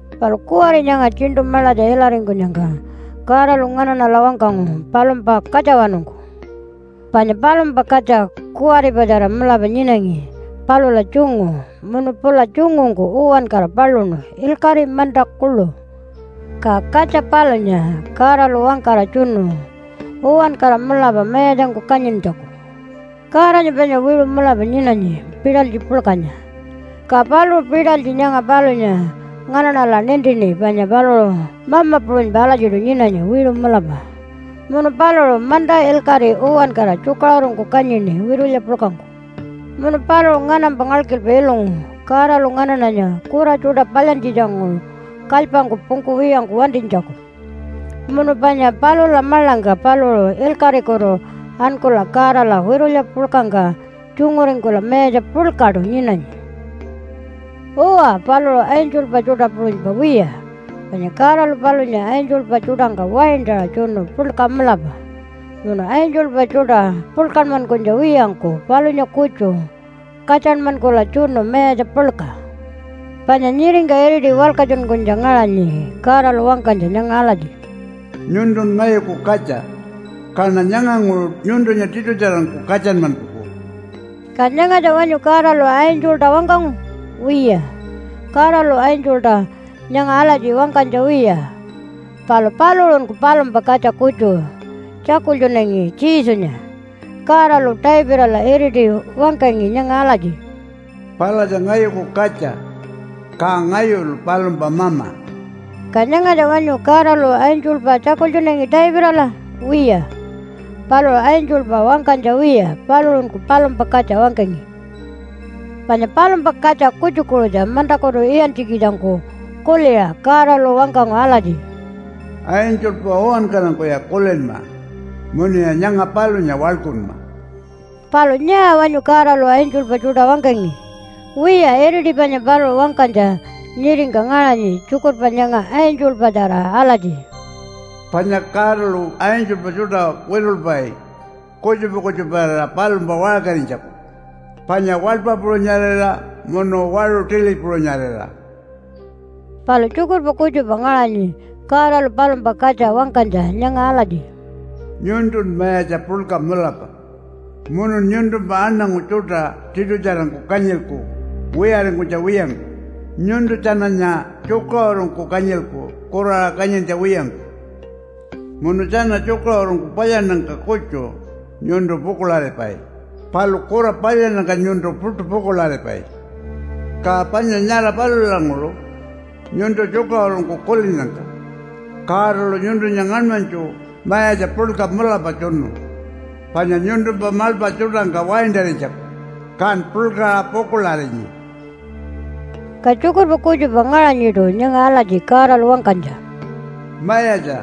Palu kuwari nyanga tjiṉṯu maḻatja ilaringkunyangka Godalu nganaṉala wangkangu palumpa katjawanungku. Panya palumpa katja kuwaripatjara mulapa nyinangi palula tjungu munu pula tjungungku uwankara paluṉu ilkaṟi, manta kuḻu. Ka katja palunya Godalu wangkara tjunu uwankara mulapa mayatjangku kanyintjaku. Godanya panya wiṟu mulapa nyinanyi pitalytji puḻkanya, ka paluṟu pitalytji nyanga palunya nganaṉala nintini panya paluṟu Mama puṟunypa alatjiṯu nyinanyi, wiṟu mulapa. Munu paluṟu manta ilkaṟi uwankara tjukaṟurungku kanyini witulya puḻkangku. Munu paluṟu nganampa ngalkilpa ilungu Godalu nganaṉanya kura tjuṯa palyantjitjanguṟu kalypangku pungkuwiyangku wantinytjaku. Munu panya palula maḻangka paluṟu ilkaṟikutu ankula Godala witulya puḻkangka tjunguringkula mayatja puḻkaṯu nyinanyi. Uwa, paluṟu angelpa tjuṯa puṟunypa wiya. Panya Godalu palunya angelpa tjuṯangka waintaṟa tjunu puḻka mulapa. Munu angelpa tjuṯa puḻkanmankunytja wiyangku palunya kutju katjanmankula tjunu mayatja puḻka. Panya nyiringka iriti walkatjunkunytja ngaṟanyi Godalu wangkanytja nyanga alatji, “Nyuntun ngayuku katja, kaṉa nyanganguṟu nyuntunya tiṯutjarangku katjanmankuku.” Ka nyangatja wanyu Godalu angelta wangkangu? Wiya, Godalu angelta nyanga alatji wangkanytja wiya. Palu paluṟunku palumpa katja kutju tjakultjunangi Jesunya. Godalu Davidala iriti wangkangi nyanga alatji, “Palatja ngayuku katja, ka ngayulu palumpa Mama.” Ka nyangatja wanyu Godalu angelpa tjakultjunangi Davidala? Wiya, paluṟu angelpa wangkanytja wiya, paluṟunku palumpa katja wangkangi. Panya palumpa katja kutjukuṟutja mantakutu iyantjikitjangku kuliṟa Godalu wangkangu alatji, “Angelpa uwankarangkuya kulinma munuya nyanga palunya waḻkunma.” Palu nyaa wanyu Godalu angelpa tjuṯa wangkangi? Wiya, iriti panya paluṟu wangkanytja nyiringka ngaṟanyi tjukurpa nyanga angelpatjara alatji, “Panya Godalu angelpa tjuṯa witulpai kutjupa kutjuparira palumpa waṟkarinytjaku, panya waḻpa puṟunyarira munu waṟu tili puṟunyarira.” Palu tjukurpa kutjupa ngaṟanyi Godalu palumpa katja wangkanytja nyanga alatji, “Nyuntun mayatja puḻka mulapa munun nyuntumpa aṉangu tjuṯa tiṯutjarangku kanyilku wiyaringkunytja wiyangku. Nyuntu tjananya tjukaṟurungku kanyilku kuraṟa kanyintja wiyangku. Munu tjana tjukaṟurungku palyannyangka kutju nyuntu pukuḻaripai palu kura palyannyangka nyuntu puṯu pukuḻaripai. Ka panya nyara palulanguṟu nyuntu tjukaṟurungku kulinnyangka Godalu nyuntunya ngaṉmanytju mayatja puḻka mulapa tjunu panya nyuntumpa maḻpa tjuṯangka waintarinytjaku, kan puḻkaṟa pukuḻarinyi.” Ka tjukurpa kutjupa ngaṟanyiṯu nyanga alatji Godalu wangkanytja, “Mayatja,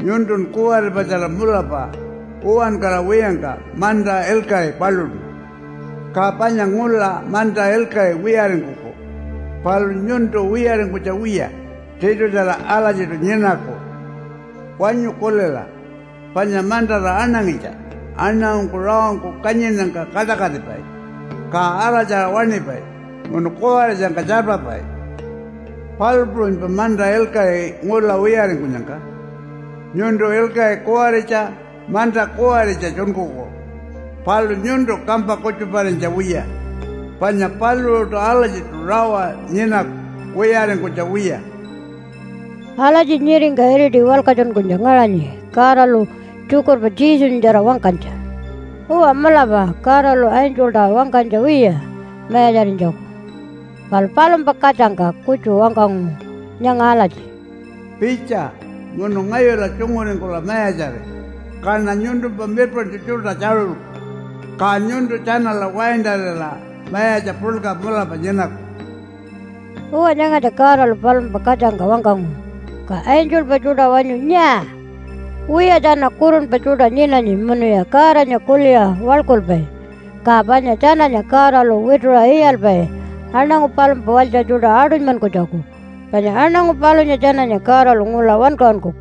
nyuntun kuwaripatjara mulapa uwankara wiyangka manta ilkaṟi paluṉu, Ka panya ngula manta ilkaṟi wiyaringkuku, palu nyuntu wiyaringkunytja wiya tiṯutjara alatjiṯu nyinaku. Wanyu kulila panya mantara aṉangitja aṉangungku rawangku kanyinnyangka kaṯakatipai ka araltjaṟa waṉipai munu kuwaritjangka tjarpapai. Palu puṟunypa manta ilkaṟi ngula wiyaringkunyangka nyuntu ilkaṟi kuwaritja manta kuwaritja tjunkuku. Palu nyuntu kampa kutjuparinytja wiya panya paluṟuṯu alatjiṯu rawa nyinaku wiyaringkunytja wiya.” Alatji nyiringka iriti walkatjunkunytja ngaṟanyi Godalu tjukurpa Jesunyatjara wangkanytja. Uwa, mulapa Godalu angelta wangkanytja wiya mayatjarinytjaku, palu palumpa katjangka kutju wangkangu nyanga alatji, “Pitja munu ngayula tjunguringkula mayatjari, kaṉa nyuntumpa mirpaṉtju tjuṯa tjaṟulku, ka nyuntu tjanala waintarira mayatja puḻka mulapa nyinaku.” Uwa, nyangatja Godalu palumpa katjangka wangkangu. Ka angelpa tjuṯa wanyu nyaa? Wiya, tjana kurunpa tjuṯa nyinanyi munuya Godanya kuliṟa waḻkulpai, ka panya tjananya Godalu wituṟa iyalpai aṉangu palumpa walytja tjuṯa aṯunymankunytjaku. Panya aṉangu palunya tjananya Godalu ngula wankaṟunkuku.